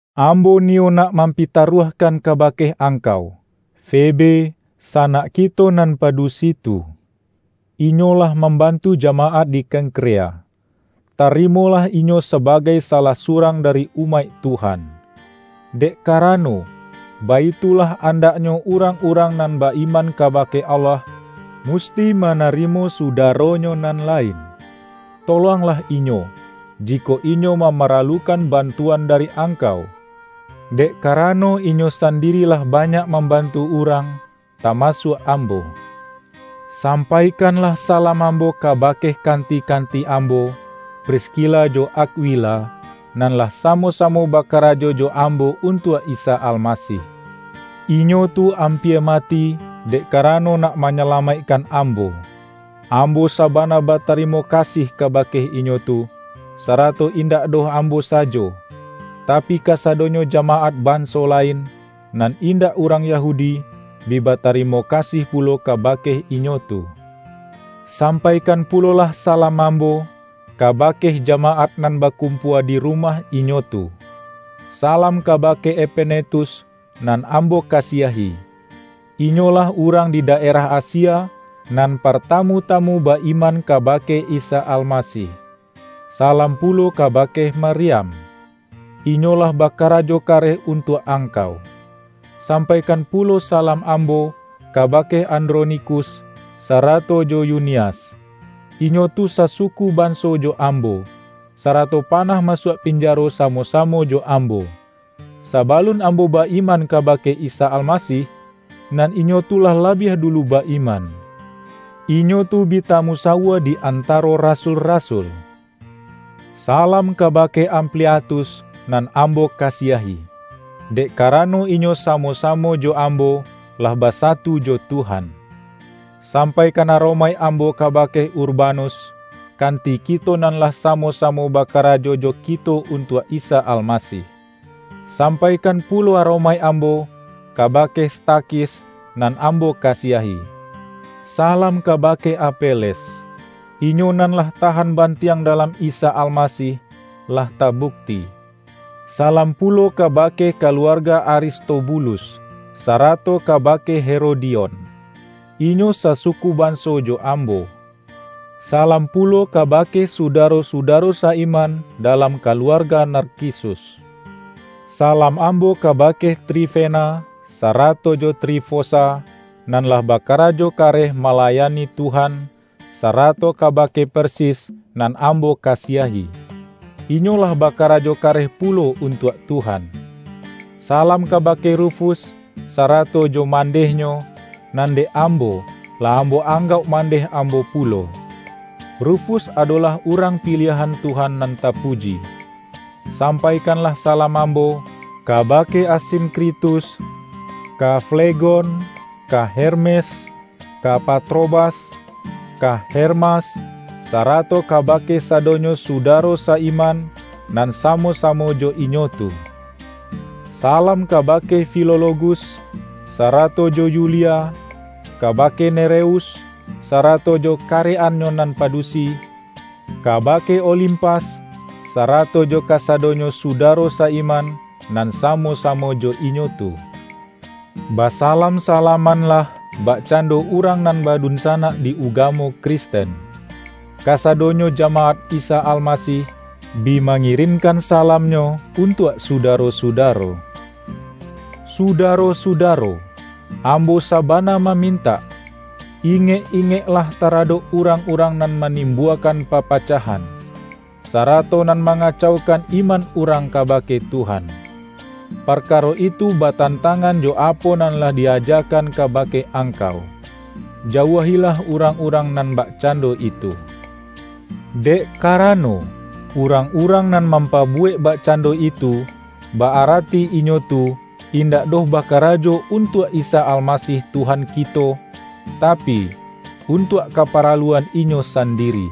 Ambo niyo nak mampitaruah-kan kabake angkau, Febe, sanak kito nan padusi tu. Inyo lah mambantu jamaat di Kengkrea. Tarimolah inyo sabagai salah surang dari umaik Tuhan. Dek karano, baitulah andaknyo urang-urang nan ba-iman kabake Allah, musti manarimo sudaronyo nan lain. Tolonglah inyo, jikok inyo mamaralukan bantuan dari angkau, dek karano inyo sandiri lah banyak mambantu urang - tamasuak ambo. Sampaikanlah salam ambo kabake kanti-kanti ambo, Priskila jo Akwila, nan lah samo-samo bakarajo jo ambo untuak Isa Almasih. Inyo tu ampia mati, dek karano nak manyalamaikkan ambo. Ambo sabana batarimo kasih kabake inyo tu - sarato indak doh ambo sajo, tapi, kasadonyo jamaat banso lain, nan indak urang Yahudi, bi batarimo kasih pulo kabake inyo tu. Sampaikan pulolah salam ambo, kabake jamaat nan bakumpua di rumah inyo tu. Salam kabake Epenetus nan ambo kasiahi. Inyolah urang di daerah Asia, nan partamu-tamu ba-iman kabake Isa Almasih. Salam pulo kabake Maryam. Inyo lah bakarajo kareh untuak angkau. Sampaikan pulo salam ambo, kabake Andronikus, sarato jo Yunias. Inyo tu sasuku banso jo ambo, sarato panah masuak pinjaro samo-samo jo ambo. Sabalun ambo ba-iman kabake Isa Almasih, nan inyo tu lah labiah dulu ba-iman. Inyo tu bi tamusawua di antaro rasul-rasul. Salam kabake Ampliatus nan ambo kasiahi, dek karano inyo samo-samo jo ambo, lah basatu jo Tuhan. Sampaikan aromaik ambo kabake Urbanus, kanti kito nan lah samo-samo bakarajo jo kito untuak Isa Almasih. Sampaikan pulo aromaik ambo, kabake Stakhis nan ambo kasiahi. Salam kabake Apeles. Inyo nan lah tahan bantiang dalam Isa Almasih, lah tabukti. Salam pulo kabake kaluarga Aristobulus, sarato kabake Herodion. Inyo sasuku banso jo ambo. Salam pulo kabake sudaro-sudaro sa-iman dalam kaluarga Narkisus. Salam ambo kabake Trifena, sarato jo Trifosa, nan lah bakarajo kareh malayani Tuhan, sarato kabake Persis nan ambo kasiahi. Inyo lah bakarajo kareh pulo untuak Tuhan. Salam kabake Rufus, sarato jo mandehnyo, nan dek ambo, lah ambo anggauk mandeh ambo pulo. Rufus adolah urang piliahan Tuhan nan tapuji. Sampaikanlah salam ambo, kabake Asinkritus, ka Flegon, ka Hermes, ka Patrobas, ka Hermas, sarato kabake sadonyo sudaro sa-iman, nan samo-samo jo inyo tu. Salam kabake Filologus, sarato jo Yulia; kabake Nereus, sarato jo karek-annyo nan padusi; kabake Olimpas, sarato jo kasadonyo sudaro sa-iman nan samo-samo jo inyo tu. Basalam-salamanlah bakcando urang nan badunsanak di ugamo Kristen. Kasadonyo jamaat Isa Almasih, bi mangirinkan salamnyo untuak sudaro-sudaro. Sudaro-sudaro! Ambo sabana mamintak: Ingek-ingeklah taradok urang-urang nan manimbuakan papacahan, sarato nan mangacaukan iman urang kabake Tuhan. Parkaro itu batantangan jo apo nan lah di-ajakan kabake angkau. Jauahilah urang-urang nan bakcando itu. Dek karano, urang-urang nan mampabuwek bakcando itu, ba-arati inyo tu, indak doh bakarajo untuak Isa Almasih Tuhan kito, tapi, untuak kaparaluan inyo sandiri.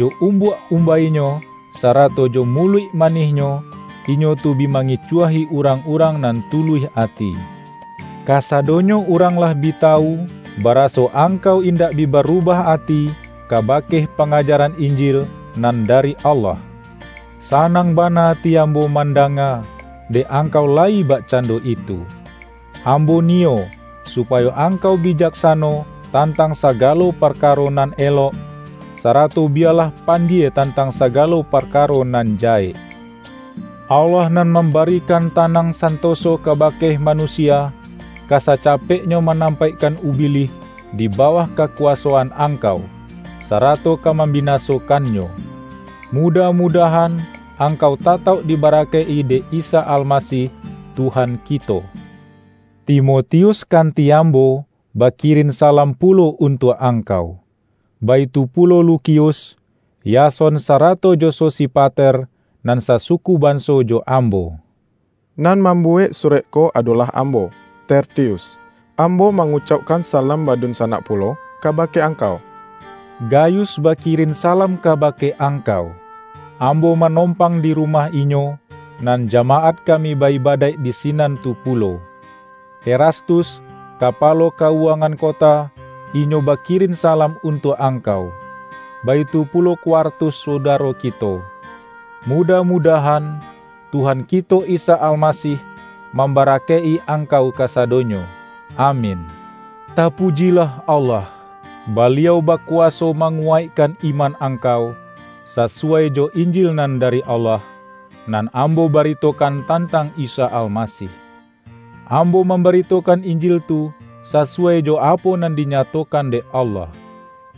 Jo umbuak-umbainyo, sarato jo muluik manihnyo, inyo tu bi mangicuahi urang-urang nan tuluih ati. Kasadonyo urang lah bi tawu, baraso angkau indak bi barubah ati kabake pangajaran Injil nan dari Allah. Sanang bana ati ambo mandanga, dek angkau layi bakcando itu. Ambo niyo, supayo angkau bijaksano tantang sagalo parkaro nan elok, sarato biyalah pandie tantang sagalo parkaro nan jahek. Allah nan mambarikan tanang santoso kabake manusia, ka sacapeknyo manampaikkan Ubilih di bawah kakuwasoan angkau, sarato ka mambinasokannyo. Mudah-mudahan, angkau tatauk dibarakaik-i dek Isa Almasih Tuhan kito! Timotius kanti ambo, bakirin salam pulo untuak angkau. Baitu pulo Lukius, Yason sarato jo Sosipater, nan sasuku banso jo ambo. Nan mambuwek surek ko adolah ambo, Tertius. Ambo mangucaukkan salam badunsanak pulo kabake angkau. Gayus bakirin salam kabake angkau. Ambo manompang di rumah inyo, nan jamaat kami ba-ibadaik di sinan tu pulo. Erastus, kapalo ka-uwangan kota, inyo bakirin salam untuak angkau. Baitu pulo Kwartus sudaro kito. Mudah-mudahan, Tuhan kito Isa Almasih mambarakaik-i angkau kasadonyo. Amin! Tapujilah Allah! Baliau bakuwaso manguwaikkan iman angkau, sasuwai jo Injil nan dari Allah, nan ambo baritokan tantang Isa Almasih. Ambo mambaritokan Injil tu sasuwai jo apo nan dinyatokan dek Allah;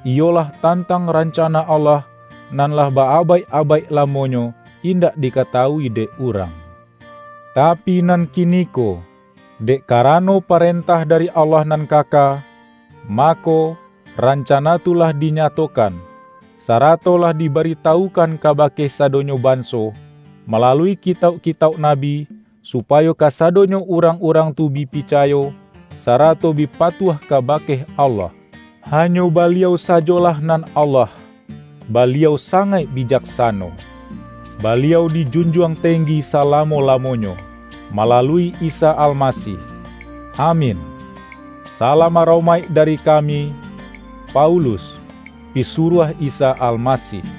iyolah tantang rancana Allah, nan lah ba-abaik-abaik lamonyo indak dikatawui dek urang. Tapi nan kiniko, dek karano parentah dari Allah nan kaka, mako, rancana tu lah dinyatokan, sarato lah dibaritawukan kabake sadonyo banso, malalui kitauk-kitauk nabi, supayo kasadonyo urang-urang tu bi picayo, sarato bi patuah kabake Allah. Hanyo Baliau sajolah nan Allah, Baliau sangaik bijaksano. Baliau dijunjuang tenggi salamo-lamonyo, malalui Isa Almasih! Amin! Salam aromaik dari kami, Paulus, pisuruah Isa Almasih